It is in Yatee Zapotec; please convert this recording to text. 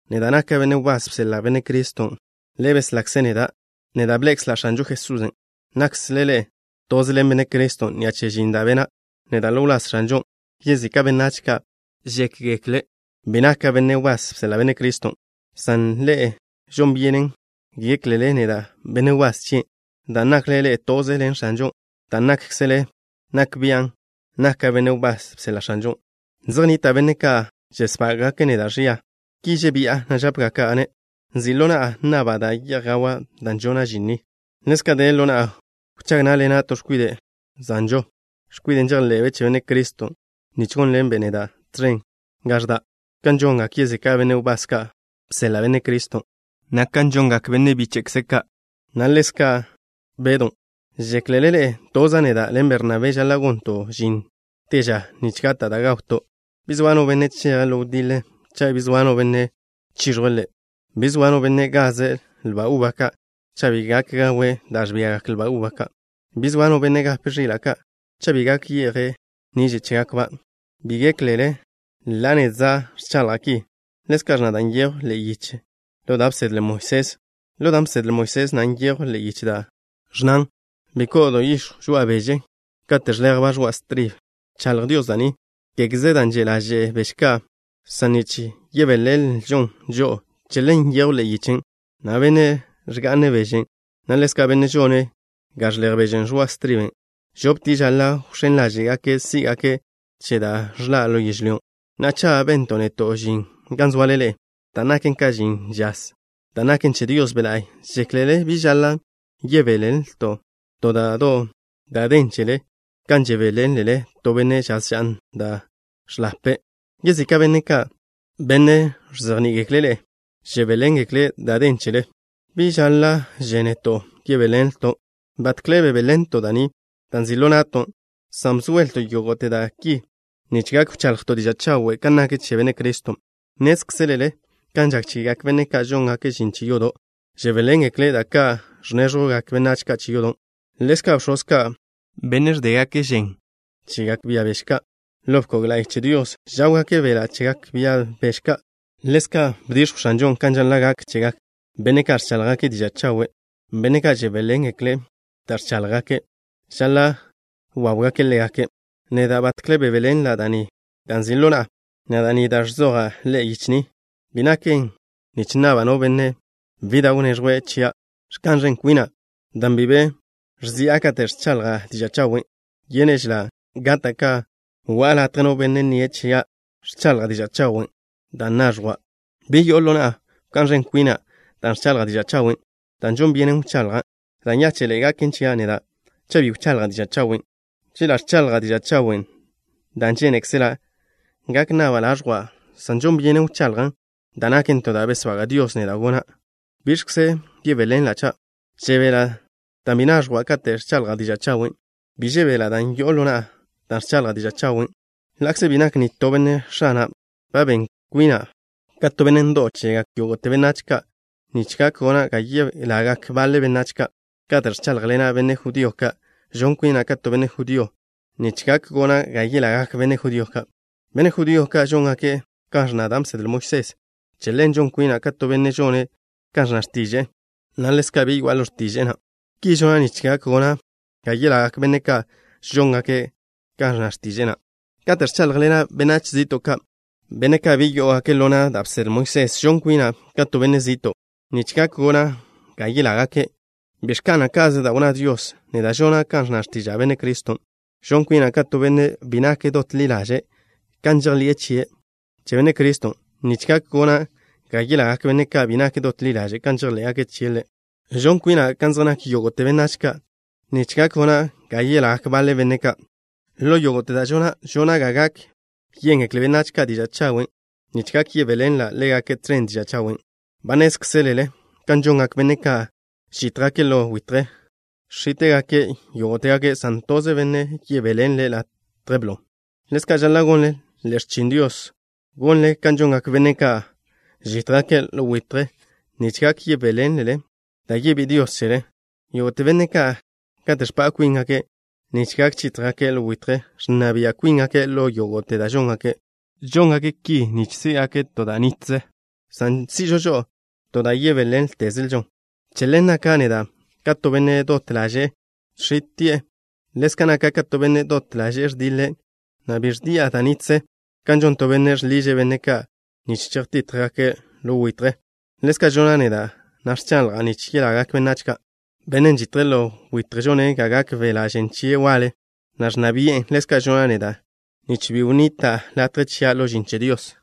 Neda' naka' benne' wbás bseḻa' Benne' Criston'. Ḻe' beslakze' neda'. Neda' bḻe'ekzla' X̱anžo Jesusen'. Nakkzle ḻe'e toze ḻen Benne' Criston' ni'a che žin da' bena' neda' ḻo wláz X̱anžon'. Yezika' benách ka' gak gékgekle' bi naka' benne' wbás bseḻa' Benne' Criston', san ḻe'e žon byenen géklele naka' benne' wbás chien'. Dan' nakle ḻe'e toze ḻen X̱anžon', da' nákkzele nak bian' naka' benne' wbás bseḻa' X̱anžon'. Zej nnita' benne' ka' ẕesbága'gake' neda' ẕia. Ki žebi'a, na' žápgaka'-ne': nzi' ḻo na'a nnaba' da' ye'j gawa' dan' žona' žin ni. Ḻezka' de ḻo na'a wchág ná'ḻena' to x̱kwide' zanžo, x̱kwiden' žejḻe'be' che Benne' Criston', nich gónḻenbe' neda' tẕen gan ẕda', kan žongak yezika' benne' wbás ka' bseḻa' Benne' Criston', na' kan žongak benne' bíche'kze' ka', na' ḻezka' Bedon'. ¿Žéklele ḻe'e toza' neda' ḻen Bernabé žaḻa' gonto' žin te ža, nich gata' da' gawto'? Bi zoa no benne' cheje' ḻo wdiḻe, cha' bi zoa no benne' chiẕjwe' ḻe'. Bi zoa no benne' gaze' lba uba ka', cha' bi gak gawe' da' ẕbiagak lba ka'. Bi zoa no benne' gape' ẕila' ka', cha' bi gak ye'je' niže' chégakba'. Bi géklele ḻa' nedza' ẕchaḻja' ki. Ḻezka' ẕnna da' nyejw ḻe'e yiche ḻo da' bsedle Moisés. Ḻo dan' bsedle Moisés na' nyejw ḻe'e yiche da' ẕnnan: “Bi ko'o do yix̱jw žoa'a beže kate' ẕḻejba' ẕoa' stribe.” Bchaḻj Dios da' ni, kégeze dan' že' ḻaže'e beže ka', san nich yebéḻenlžon žo'o. Che ḻen nyejwn ḻe'e yichen', na' benne' ẕga'ne' beže, na' ḻezka' benne' žone' ga ẕḻej beže ẕoa' striben', žoptie' žaḻa' wx̱én ḻáže'gake' sí'gake' che da' ẕḻa' ḻo yežlyón'. Na'a, cha' bento' neto' žin gan zoale ḻe'e, dan' naken ka žin žaz, dan' naken che Dios Be' La'y, ¿žéklele bi žaḻa' yebéḻenlto' to da' do' da' den chele kan žebéḻenle to benne' žaz ža'n da' ẕḻape'? Yezika' benne' ka', benne' ẕzejní'igekle' ḻe'e, žebéḻengekle' da' den chele. ¿Bi žáḻa'že neto' yebéḻenlton'? Batkle bebéḻenlto' da' ni da' nzi' ḻo na'ton', san bzoelto' yógo'te da' ki nich gak wchaḻjto' diža' chawe' kan nak che Benne' Criston'. Nnézkzelele kan žak chegak benne' ka' žóngake' žin che yodo', žebéḻengekle' da' ka' ẕnéẕjwgak benách che yodo'. Ḻezka' bx̱oz ka', benne' ẕdégake' žen chegak bia beže ka' ḻo bkog la'y che Dios, žáwgake' beḻa' chegak bia beže ka'. Ḻezka' bdix̱jw X̱anžon' kan žaḻa' gak chegak benne' ka' ẕcháḻjgake' diža' chawe'. Benne' ka' žebéḻengekle' da' ẕcháḻjgake' žaḻa' wáwgake' ḻégake'. Neda' batkle bebéḻenla' da' ni da' nzi' ḻo na'a, na' da' ni da' ẕzoja' ḻe'e yiche ni, bi naken nich nnabla' no benne' bi da' wneẕjwe' chia'. Ẕka'n ẕen kwina' dan' bi be ẕzi'a kate' ẕchaḻja' diža' chawen'. Yénežela' gata' ka go'a latje no benne' nnie' chia' ẕchaḻja' diža' chawen' dan' naẕjwa'. Bi yo'o ḻo na'a wká'n ẕen kwina' dan' ẕchaḻja' diža' chawen', dan' žon byenen wchaḻjan'. Da' nyáche'ḻe'e gaken chia' neda' cha' bi wchaḻja' diža' chawen'. Chela' ẕchaḻja' diža' chawen' dan' žénekzela', gak nnaba' laẕjwa', san žon byenen wchaḻjan', dan' naken to da' besbaga' Dios neda' gona'. ¿Biẕkze yebéḻenla' cha'? Žebela' dan' bi naẕjwa' kate' ẕchaḻja' diža' chawen'. Bi žebéḻenla' dan' yo'o ḻo na'a dan' ẕchaḻja' diža' chawen'. Na'a, ḻa'kze bi nak nitó benne' x̱ana', ba ben kwina' ka to benne' ndo'w chegak yógo'te benách ka' nich gak gona' ga yelagak baḻe benách ka'. Kate' ẕcháḻjḻena' benne' judío ka', žon kwina' ka to benne' judío nich gak gona' ga yelagak benne' judío ka'. Benne' judío ka' žóngake' kan ẕnna da' bsedle Moisés. Che ḻen žon kwina' ka to benne' žone' kan ẕnna x̱tiže'e na', ḻa'kze bi yoa'a ḻo na' x̱tiže'e na'. Ki žona' nich gak gona' ga yelagak benne' ka' žóngake' kan ẕnna x̱tiže'e na'. Kate' ẕcháḻjḻena' benách zi'to' ka', benne' ka' bi yó'ogake' ḻo na' da' bsedle Moisés, žon kwina' ka to benne' zi'to' na', nich gak gona' ga yelágake'. Bi ẕka'na' ka'ze da' wnná Dios. Neda' žona' kan ẕnna x̱tiža' Benne' Criston'. Žon kwina' ka to benne' bi nak dot ḻi ḻaže' kan žejḻi'e che Benne' Criston' nich gak gona' ga yelagak benne' ka' bi nak dot ḻi ḻaže' kan žejḻé'gake' chie' Ḻe'. Žon kwina' kan zej nak yógo'te benách ka' nich gak gona' ga yelagak baḻe benne' ka'. Ḻo yógo'te da' žona', žona' ga gak yéngekle benách ka' diža' chawen', nich gak yebéḻenla' ḻégake' tẕen diža' chawen'. Ba nnézkzelele kan žongak benne' ka' žítjgake' ḻo witje. Žx̱íte'gake' yógo'tegake', san toze benne' yebéḻenle' latje blo. Ḻezka' žaḻa' gonle ḻe'e x̱chin Dios, gonle kan žongak benne' ka' žítjgake' ḻo witje, nich gak yebéḻenlele da' yebí'i Dios chele. Yógo'te benne' ka', kate' ẕpa' kwíngake' nich gak chítjgake' ḻo witje, ẕnna bia' kwíngake' ḻo yógo'te da' žóngake'. Žóngake' ki nich sí'gake' to da' naken zin da' nitlen, san si'žo žo'o to da' yebéḻentezelžon. Che ḻen, naka' neda' ka to benne' dot ḻaže'e žx̱íti'e. Ḻezka' naka' ka to benne', dot ḻaže'e ẕdiḻe', na' bi ẕdi'a da' nitze. Kan žon to benne' žḻiže' benne' ka' nich chejtítjgake' ḻo witje, ḻezka' žona' neda', na' ẕchaḻja' nich yelagak benách ka'. Bennen' žitje' ḻo witje žone' ga gak beḻa' žen chie' waḻe, na' ẕnna bi'en. Ḻezka' žona' neda', nich bi wnita' latje chia' ḻo žin che Dios.